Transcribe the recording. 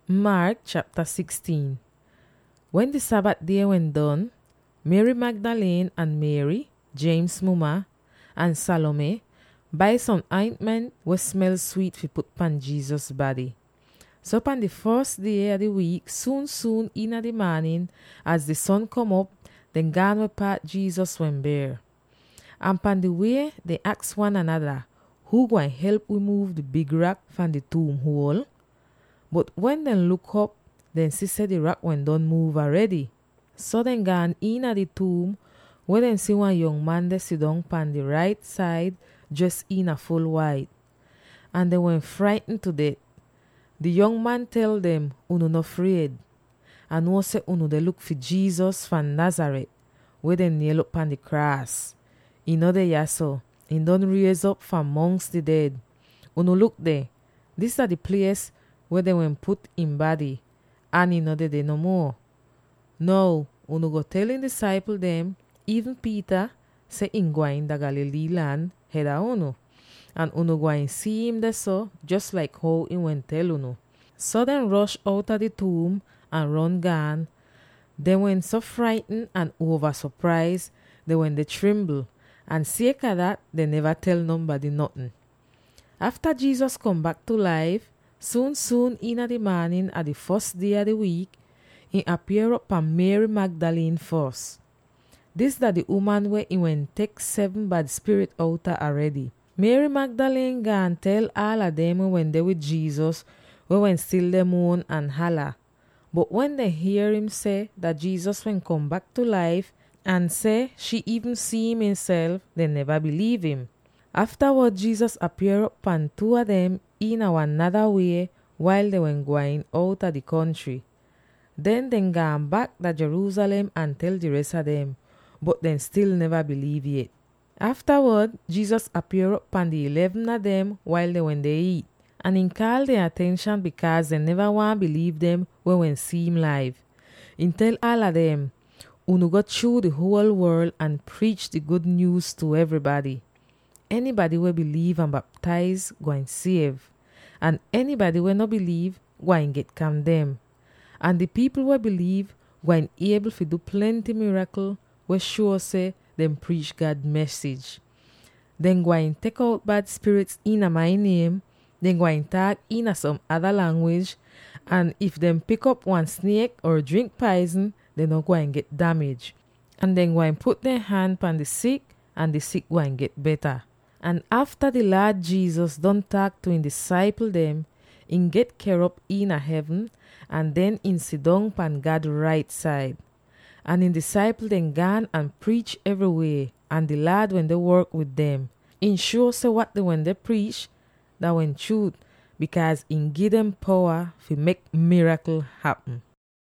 Jesus deh liv agen! Wen di Sabat die wehn don, Mary Magdalene, ahn Mary, James muma, ahn Salome bai som aintment weh smel swiit fi put pan Jesus bady. So pan di fos die a di wiik, suun-suun iina di maanin, az di son kom op, dehn gaan weh paat Jesus wehn ber. Ahn pan di wie dehn aks wan anada, “Huu gwain help wi muuv di big rak fahn di tuum huol?” Bot wen dehn luk op, dehn si seh di rak wehn don muuv aredy. So dehn gaan iina di tuum weh dehn si wan yong man deh sidong pahn dehn rait said dres iina ful wait. Ahn dehn wehn fraitn tu det. Di yong man tel dem, “Unu no fried! Ah nuo seh unu deh luk fi Jesus fahn Nazareth weh dehn niel'op pahn di kraas. Ihn no deh yahso; ihn don riez'op fahn mongs di ded! Unu luk deh; dis dah di plies weh dehn wehn put ihn bady, ahn ihn no dedeh no muo. Now unu go tel ihn disaipl dem —iivn Peter— seh, ihn gwain dah Galilee lan hed a unu ahn unu gwain si'im dehso, jos laik how ihn wehn tel unu.” So dehn rosh outa di tuum ahn ron gaan; dehn wehn so fraitn ahn uova sopraiz dehn wende trimbl. Ahn sieka dat, dehn neva tel nonbady notn. [Afta Jesus kom bak tu laif, suun-suun iina di maanin a di fos die a di wiik, ihn apier'op pan Mary Magdalene fos. Dis dah di uman weh ihn wehn tek seven bad spirit outa aredy. Mary Magdalene gaan tel aala dem weh wende wid Jesus, weh wehn stil deh muon ahn hala. Bot wen dehn hier im seh Jesus wehn kom bak tu laif, ahn seh shii iivn si'im ihnself, dehn neva biliiv im. Aftawod, Jesus apier'op pan two a dem iina wan nada wie wail dehn wen gwain outa di kontry. Den dehn gaan bak dah Jerusalem ahn tel di res a dem, bot dehn stil neva biliiv yet. Aftawod Jesus apier'op pan di eleven a dem wail dehn wende iit. Ahn ihn kaal dehn atenshan, bikaaz dehn neva waahn biliiv dem weh wehn si'im laiv. Ihn tel aala dem, “Unu go chruu di huol worl ahn priich di gud nyuuz tu evrybady. Enybady weh biliiv ahn baptaiz gwain siev, ahn enybady weh no biliiv gwain get kandem. Ahn di pipl weh biliiv gwain iebl fi du plenty mirakl weh shuo seh dehn priich God mesij. Dehn gwain tek out bad spirit iina mai niem; dehn gwain taak iina som ada langwij; ahn if dehn pik op wan sniek, or drink paizn, dehn no gwain get damij, ahn dehn gwain put dehn han pan di sik ahn di sik gwain get beta.” Ahn afta di Laad Jesus don taak tu ihn disaipl dem, ihn get ker'op dah hevn ahn den ihn sidong pahn God rait said. Ahn ihn disaipl dem gaan ahn priich evrywie, ahn di Laad wende work wid dem. Ihn shuo seh wat dehn wende priich dah wehn chruut, bikaaz ihn gi dem powa fi mek mirakl hapm.]